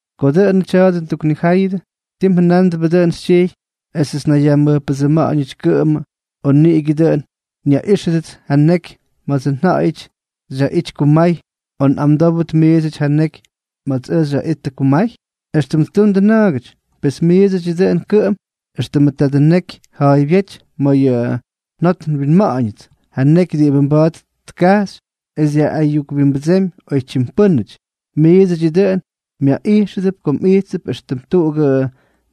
Ko dʉꞌʉnʉ tya̱a̱dʉ nduknijáyʉdʉ, ¿ti mjʉnándʉbʉ dʉꞌʉn xytyijy esʉts nnayyajmʉjpʉdsʉma̱ꞌa̱ñʉty kʉꞌʉmʉ, o nigutikyʉ dʉꞌʉn nyaꞌíxʉdʉts ja neky ma̱ts ja̱ꞌa̱yʉty xyaꞌity kumay, o nꞌamdówdʉt miidsʉty ja neky ma̱ts ʉj xyaꞌittʉ kumay?, éxtʉm ttundʉ na̱ꞌa̱gʉty. Pes miidsʉdyʉ dʉꞌʉn kʉꞌʉm éxtʉmʉ tadʉ nekyʉ ja̱a̱ybyéty ma̱ yʉ njot nwinma̱ꞌa̱ñʉts, ja neky diꞌibʉ mba̱a̱t tkajxy es dyaꞌꞌayukwimbʉdsemy oytyim pʉ́nʉty. Miidsʉdyʉ dʉꞌʉn myaꞌijxʉdʉp ko mꞌijttʉp éxtʉm tuꞌugʉ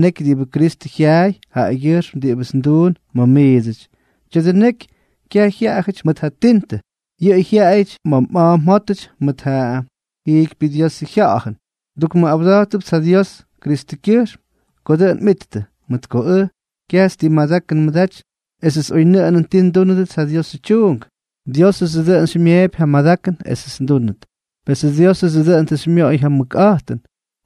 neky diꞌibʉ Kristʉ jyaay jaꞌagyʉjxm diꞌibʉts nduun ma̱ miidsʉty. Tya̱dʉ neky kyaj jyaꞌayʉty mʉt ja tintʉ, yʉꞌʉ jyaꞌayʉty ma̱ mꞌa̱a̱ mjótʉty mʉt ja jiikypyʉ Diosʉ Jya̱ꞌa̱jʉn. Ndukmʉꞌawda̱jtʉpts ja Dios Kristʉkyʉjxm ko dʉꞌʉn mꞌittʉ. Mʉt ko ʉj, kyajts ti madakʉn nmʉdaty esʉts oynʉꞌʉnʉn ti ndúnʉdʉts ja Diosʉ tyuunk, Diósʉdsʉ dʉꞌʉn xymyeepy ja madakʉn esʉts ndúnʉt. Pesʉ Diósʉdsʉ dʉꞌʉn tʉ xymyoꞌoy ja mʉkꞌa̱jtʉn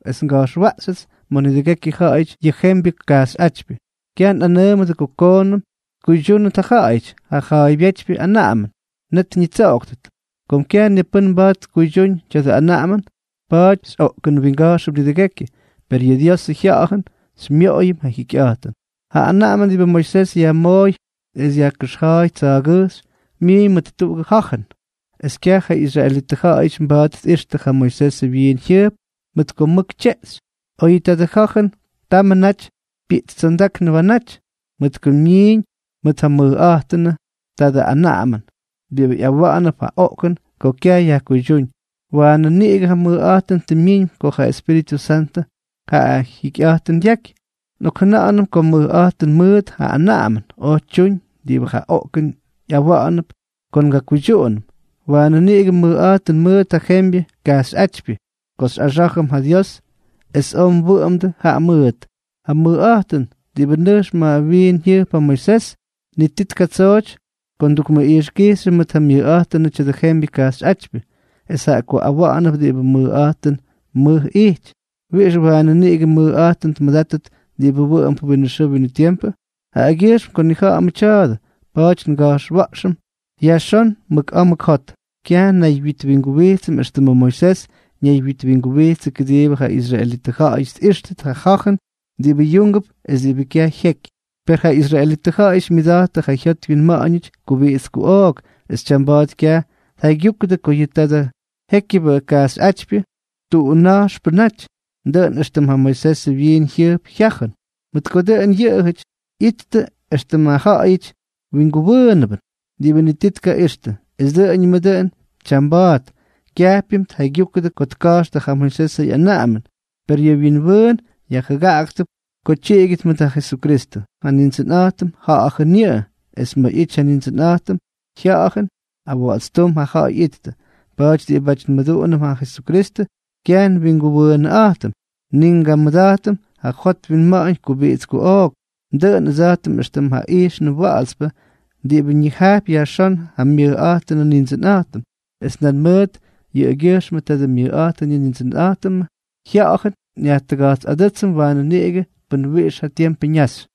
es nga̱jxwaꞌxyʉts ma̱ nidʉgekyʉ ja̱ꞌa̱yʉty yʉ jembyʉ kajxyꞌátypyʉ. Kyaj nꞌanʉʉmʉdʉ ko koonʉm tkuydyúndʉt ja ja̱ꞌa̱yʉty yʉ ja̱a̱ybyétypyʉ anaꞌamʉn, net ñitsoꞌoktʉt. Kom kyaj ni pʉ́n mba̱a̱t tkuydyúñ tya̱dʉ anaꞌamʉn, pa̱a̱ty xyꞌoꞌkʉnwinga̱jxʉm nidʉgekyʉ, per yʉ Diosʉ Jya̱ꞌa̱jʉn xymyoꞌoyʉm ja jikyꞌa̱jtʉn. Ja anaꞌamʉn diꞌibʉ Moisés yajmooy es yajkʉxja̱a̱y tsa̱a̱gʉjxy, myiiñ mʉt tuꞌugʉ ja̱jʉn, es kyaj ja israelitʉ ja̱ꞌa̱yʉty mba̱a̱t tꞌijxtʉ ja Moisesʉ wyiin jyʉjp mʉt ko mʉk tyeꞌxy, oyʉ tadʉ ja̱jʉn tamʉ naty pyiꞌtstsondáknʉ waanáty. Mʉt ko myiiñ mʉt ja mʉjꞌa̱jtʉnʉ tadʉ anaꞌamʉn diꞌibʉ ꞌyawa̱ꞌa̱nʉp ja oꞌkʉn ko kyaj yajkuydyúñ, waanʉ niꞌigʉ ja mʉjꞌa̱jtʉn tʉ myiñ ko ja Espíritʉ Santʉ ja jikyꞌa̱jtʉn dyaky. Nꞌokjʉna̱ꞌa̱nʉm ko mʉjꞌa̱jtʉn mʉʉt ja anaꞌamʉn oj tyuñ diꞌibʉ ja oꞌkʉn ꞌyawa̱ꞌa̱nʉp ko ngakuydyuꞌunʉm, ¡waanʉ niꞌigʉ mʉjꞌa̱jtʉn mʉʉt ja jembyʉ kajxyꞌátypyʉ ko xyꞌaxá̱jʉm ja Dios es oy nwʉꞌʉmdʉ jaꞌa mʉʉt! Ja mʉjꞌa̱jtʉn diꞌibʉ tʉꞌx ma̱ ja wyiin jyʉjp ja Moisés, ni ti tkatsooty ko ndukmʉꞌijxkijxyʉm mʉt ja myʉjꞌa̱jtʉnʉ tya̱dʉ jembyʉ kajxyꞌátypyʉ. Es jaꞌa ko awaanʉp diꞌibʉ mʉjꞌa̱jtʉn mʉʉt ijty, ¿wiꞌix waanʉ niꞌigʉ mʉjꞌa̱jtʉn tkamʉdátʉt diꞌibʉ wʉꞌʉmp winʉ xʉʉ winʉ tiempʉ? Jaꞌagyʉjxm ko nnija̱ꞌa̱mʉ tya̱a̱dʉ, pa̱a̱ty nga̱jxwa̱ꞌxʉm yajxón mʉk a̱a̱ mʉk jot. Kyaj nnaywyitwinguwijtsʉm éxtʉmʉ Moisés ñaywyitwinguwijtsʉ kʉdiibʉ ja israelitʉ ja̱ꞌa̱yʉty tꞌíxtʉt ja ja̱jʉn diꞌibʉ yúngʉp es diꞌibʉ kyaj jyeky. Per ja israelitʉ ja̱ꞌa̱yʉty myʉda̱jttʉ yʉ jyot wyinma̱ꞌa̱ñʉty kubiꞌits kuꞌook, es tyamba̱a̱t kyaj tjaygyúkʉdʉ ko yʉ tadʉ jékyʉbʉ kajxyꞌátypyʉ tuꞌuna̱jxpʉ naty, dʉꞌʉn éxtʉm ja Moisesʉ wyiin jyʉjpʉ jya̱jʉn, mʉt ko dʉꞌʉn yʉꞌʉjʉty ꞌyity éxtʉm ja ja̱ꞌa̱yʉ winguwʉʉnʉbʉn, diꞌibʉ ni ti tkaꞌixtʉ. Es dʉꞌʉñʉmʉ dʉꞌʉn tyamba̱a̱t kyajpyʉm tjaygyujkʉdʉ ko tka̱jxtʉ ja Moisesʉ ꞌyanaꞌamʉn. Per yʉ wyinwʉʉn yajjʉgaꞌaktʉp ko tyiꞌigyʉdʉt mʉt ja Jesukristʉ. Ja Nindsʉnꞌa̱jtʉm, Ja̱ꞌa̱jʉn yʉꞌʉ, es ma̱ ꞌyity ja Nindsʉnꞌa̱jtʉmʉ Jya̱ꞌa̱jʉn, awa̱ꞌa̱tstúm ja ja̱ꞌa̱y ꞌyittʉ. Pa̱a̱ty diꞌibáty nmʉduꞌunʉm ja Jesukristʉ, kyaj nwinguwʉʉnꞌa̱jtʉm, ni ngamʉda̱jtʉm ja jot winma̱ꞌa̱ñ kubiꞌits kuꞌook, dʉꞌʉn ʉdsa̱jtʉm éxtʉm ja ijxnʉ wa̱ꞌa̱tspʉ diꞌibʉ ñijajpy yajxón ja myʉjꞌa̱jtʉnʉ Nindsʉnꞌa̱jtʉm, es nan mʉt yʉꞌʉgyʉjxmʉ tadʉ myʉjꞌa̱jtʉn yʉ Nindsʉnꞌa̱jtʉmʉ Jya̱ꞌa̱jʉn xyajtʉga̱jtsꞌadʉ́tsʉm waanʉ niꞌigʉ pʉn wiꞌix ja tiempʉ ñaxy.